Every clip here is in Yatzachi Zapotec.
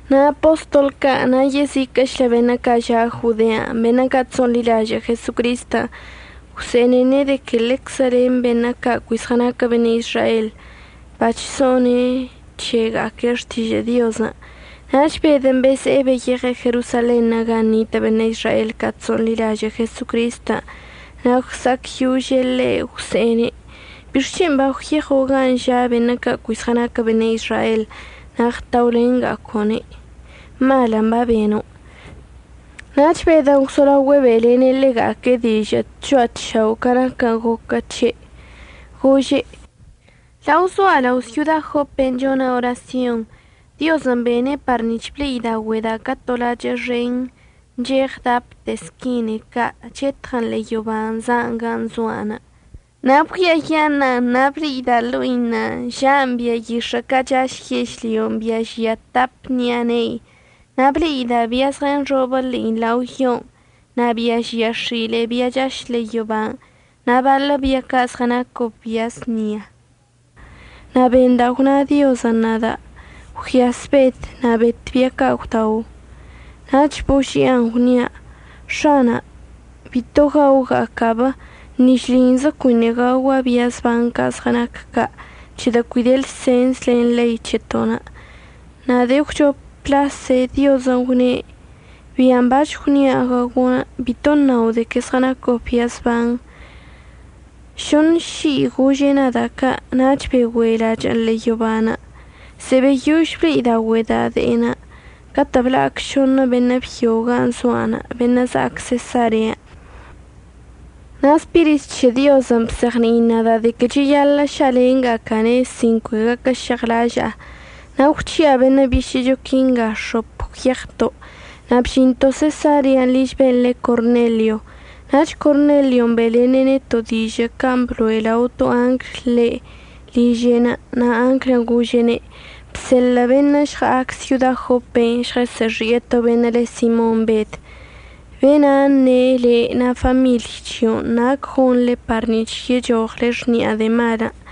Na' apostol ca' na' yeziquə'əchlə beṉə' ca' ža' Jodean' beṉə' ca' chso'onḻilažə' Jesocristən' gwse'ene' de que ḻeczə len beṉə' ca' cui zɉənaquə beṉə' Izrael bachso'one c̱hega'aque' xtižə' Diozən'. Nach Bedən' beze'e beyeɉe' Jerosalenṉə' gan' nitə' beṉə' Izrael ca' chso'onḻilažə' Jesocristən' na' gwsa'acyože' ḻe'. Gwse'ene': ―¿Bixc̱hen' bagwyeɉo' gan' ža' beṉə' ca' cui zɉənaquə beṉə' Izrael na' ɉtaolenga'aco'one'? Malən' babeno'. Nach Bedən' gwzolaogüe' be'elene' ḻega'aque' dižə'ən tcho'a tšao' ca naquən' goquə c̱he', gože': ―Lao zoa' lao' syoda Jopen' chona' orasyon Diozən' bene' par nic̱h ble'idaogüe'eda' ca to lachə' xen ncheɉ dapte squinei ca' chetɉən ḻe'e yoban' za'an gan' zo'anə'. Na' bgüiayaṉa'an na' ble'ida' ḻo'inə' ža'an bia yix̱ə' ca' chaš yežlyon' bia žia tap ṉi'a ne'i, na' ble'ida' bia zɉənxobə ḻe'i lao yo, na' bia žia x̱ile'e bia chaš ḻe'e yoban' na' baḻə bia ca' zɉənacob bia əznia. Na' benda' gwna Diozən' nada': “Gwyas Bed, na' bet bia ca' gwdao.” Nach božia'an gwnia': “X̱ana', bito gaoga'aca'ab. Ni šlinzə cuiṉə' gaogua' bia zban ca' zɉənac ca' c̱hedə' cui de lsens len ḻei c̱heto'onə'.” Na' de'e əgwchop lase Diozən' gwne': “Bian' bac̱h gwnia' gaogo' bito əṉao' de que zɉənacob bia zban.” Šoṉ ši'i gože' nada' ca' nach begüe lachə'ən ḻe'e yoban'. Ze'e beyož ble'idaogüe'eda' de'enə' catə' bla'ac šoṉə beṉə' byo gan' zoa'anə' beṉə' za'ac Sesarean'. Na' Spirit c̱he Diozən' bzeɉni'in nada' de que cheyaḻə' ša'alenga'aca'ane' sin cui gaquəžeɉlaža'a, na' gwc̱hi'a beṉə' bišə'əcho quinga x̱op gwyeɉto', na' bžinto' Sesarean' liž ben' le Cornelio. Nach Cornelion' be'elene' neto' dižə' can' blo'e lao to angl ḻe' liže'enə' na' anglən' gože'ene': “Bseḻə' beṉə' əžɉa'ac syoda Jopen' žɉəsə'əxi'e to beṉə' le Simon Bed. Be'ena' əṉe' le' na' famiḻy c̱hio' nac gonḻe par nic̱h yechoɉle xni'a de'e malən'.”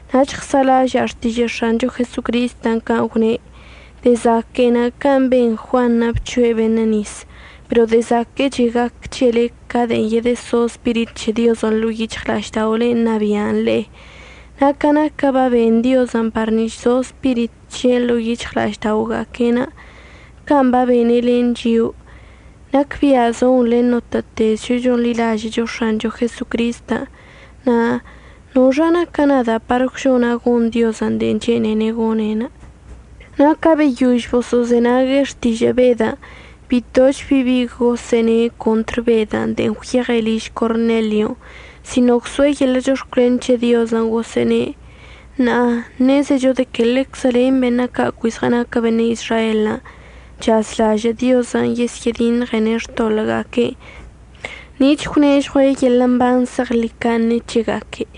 Nach ɉsa'alaža'a xtižə' X̱ancho Jesocristən' can' gwne': “De'e zaque'enə' can' ben Juanṉə' bc̱hoe' beṉə' nis, pero de'e zaquə'əche' gac c̱hele ca de'en yedəso Spirit c̱he Diozən' ḻo'o yic̱hɉla'ažda'olen' ṉabia'an le'e.” Na' ca naquən' baben Diozən' par nic̱h zo Spirit c̱he'enə' ḻo'o yic̱hɉla'aždaoga'aque'enə' can' babene' len chio'o, nacbia' zon len notə'ətezcho chonḻilažə'əcho X̱ancho Jesocristən'. Na' ¿noxa naca' nada'anə' par gwžona' gon Diozən' de'en chene'ene' gone'? Na' ca beyož boso'ozenague' xtižə' Bedən' bitoch bi bi gosə'əne' contr Bedən' de'en gwyeɉe' liž Cornelion', sino gwso'e yeḻə' chox̱cwlen c̱he Diozən', gosə'əne': ―Ṉa'a ṉezecho de que ḻeczə len beṉə' ca' cui zɉənaquə beṉə' Izrael chazlažə' Diozən' yesyə'ədiṉɉene' xtoḻə'əga'aque'enə' nic̱h əgwnežɉue' yeḻə' mban zeɉḻicaṉe c̱hega'aque'.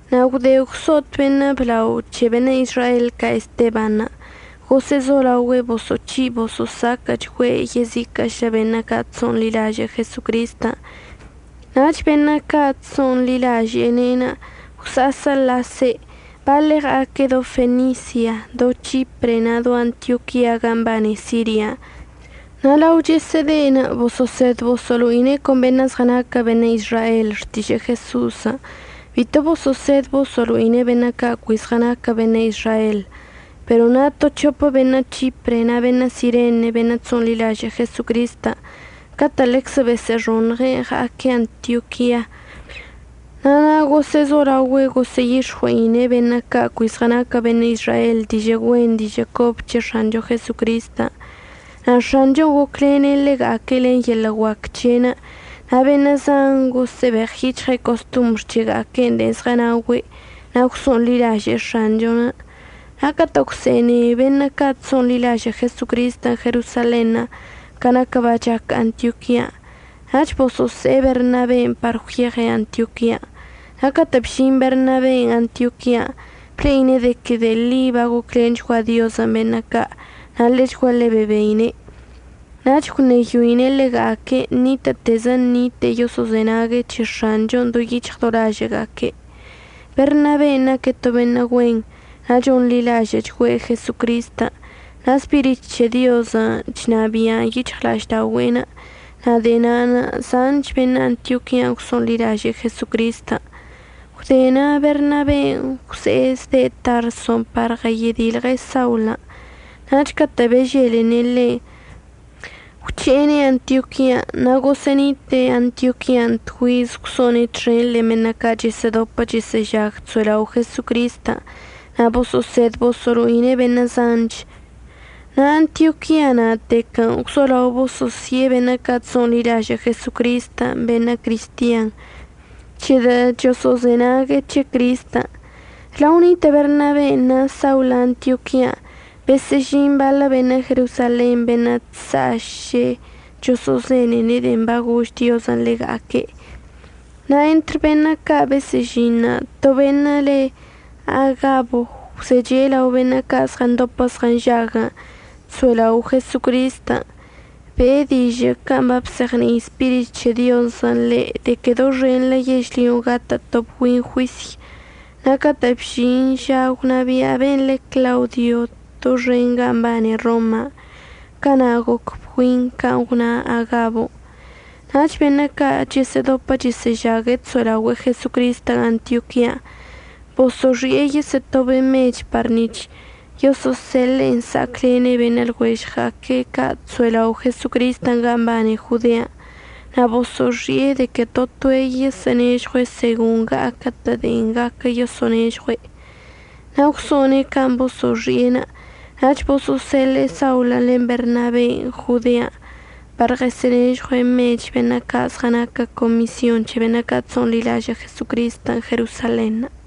Na' gwde gwso'ot beṉə' blao c̱he beṉə' Izrael ca' Estebanṉə' gosə'əzolaoga'aque' boso'oc̱hi' boso'osaquə'əchgüe' yeziquə'əchlə beṉə' ca' chso'onḻilažə' Jesocristən' nach beṉə' ca' chso'onḻilaže'ene' gwsa'asəlase', baḻe' ɉa'aque' do Fenisia, do C̱hipre na' do Antioquia ga mbane Siria. Na' lao chesə'əde'enə' boso'osed boso'olo'ine' con beṉə' zɉənaquə beṉə' Izrael xtižə' Jeso'osən', bito boso'osed boso'olo'ine'en beṉə' ca' cui zɉənaquə beṉə' Izrael. Pero na' to c̱hopə beṉə' C̱hipre na' beṉə' Sirene beṉə' chso'onḻilažə' Jesocristən' catə' ḻeczə besə'əxoṉɉe' ɉa'aque' Antioquian', na' na' gosə'əzolaogüe' gosə'əyix̱ɉue'ine' beṉə' ca' cui zɉənaquə beṉə' Izrael dižə' güen dižə' cobə c̱he X̱ancho Jesocristən'. Na' X̱anchon' goclene' ḻega'aque' len yeḻə' guac c̱he'enə' na' beṉə' zan gosə'əbeɉyic̱hɉe' costombr c̱hega'aque' de'en zɉənaogüe' na' gwso'onḻilaže'e X̱anchon'. Na' catə' gwse'ene beṉə' ca' chso'onḻilažə' Jesocristən' Jerosalenṉə' ca naquən' bachac Antioquian', nach boso'ose'e Bernaben' par gwyeɉe' Antioquian'. Na' catə' bžin Bernaben' Antioquian' ble'ine' de que de'e ḻi bagoclenchgua Diozən' beṉə' ca', na' ḻechguaḻe bebeine'. Nach gwṉeyoine' ḻega'aque' ṉitə'ətezə ṉite'e yoso'ozenague' c̱he X̱anchon' do yic̱hɉ do lažə'əga'aque'. Bernaben' naque' to beṉə' güen, na' chonḻilažə'əchgüe' Jesocristən' na' Spirit c̱he Diozən' chnabia'an yic̱hɉla'aždaogüe'enə'. Na' de'e na'anə' zanch beṉə' Antioquian' gwso'onḻilaže'e Jesocristən'. Gwde na' Bernaben' gwze'e zde' Tarson' par ɉəyedilɉe' Saulən', nach catə' beželene' ḻe', gwc̱he'ene' Antioquian'. Na' gosə'ənite'e Antioquian' tgüiz gwso'one' txen len beṉə' ca' chəsə'ədopə chəsə'əžag chso'elao' Jesocristən' na' boso'osed boso'olo'ine' beṉə' zanch. Na' Antioquia na'atequən' gwzolao boso'osi'e beṉə' ca' chso'onḻilažə' Jesocristən' beṉə' cristian c̱hedə' choso'ozenague' c̱he Cristən'. Lao nitə' Bernaben' na' Saulən' Antioquian' besə'əžin baḻə beṉə' Jerosalen beṉə' chsa'aš choso'ozenene' de'en bagož Diozən' ḻega'aque'. Na' entr beṉə' ca' besə'əžinṉə' to beṉə' le Agabo gwzeche' lao beṉə' ca' zɉəndopə zɉənžag chso'elao' Jesocristən' be'e dižə' can' babzeɉni'i Spirit c̱he Diozən' ḻe' de que doxenḻə yežlyon' gatə' to bgüin juisy. Na' catə' bžin ža gwnabia' ben' le Claudio doxen gan' mbane Roma, cana' goc bgüinṉə' can' gwna Agabon'. Nach beṉə' ca' chəsə'ədopə chəsə'əžag chso'elao' Jesocristən' Antioquian' boso'oxi'e yesə'ətobe' mech par nic̱h yosə'əseḻe'en əsa'aclene' beṉə' lɉuežɉga'aque' ca' chso'elao' Jesocristən' gan' mbane Jodean'. Na' boso'oxi'e de que to toe' yoso'onežɉue' segon ɉa'aquə'ətə' de'e gaquə yoso'onežɉue'. Na' gwso'one' can' boso'oxi'enə' nach boso'oseḻe'e Saulən' len Bernaben' Jodean' par ɉəsə'ənežɉue' mechən' beṉə' ca' zɉənaque' comisyon c̱he beṉə' ca' chso'onḻilažə' Jesocristən' Jerosalenṉə'.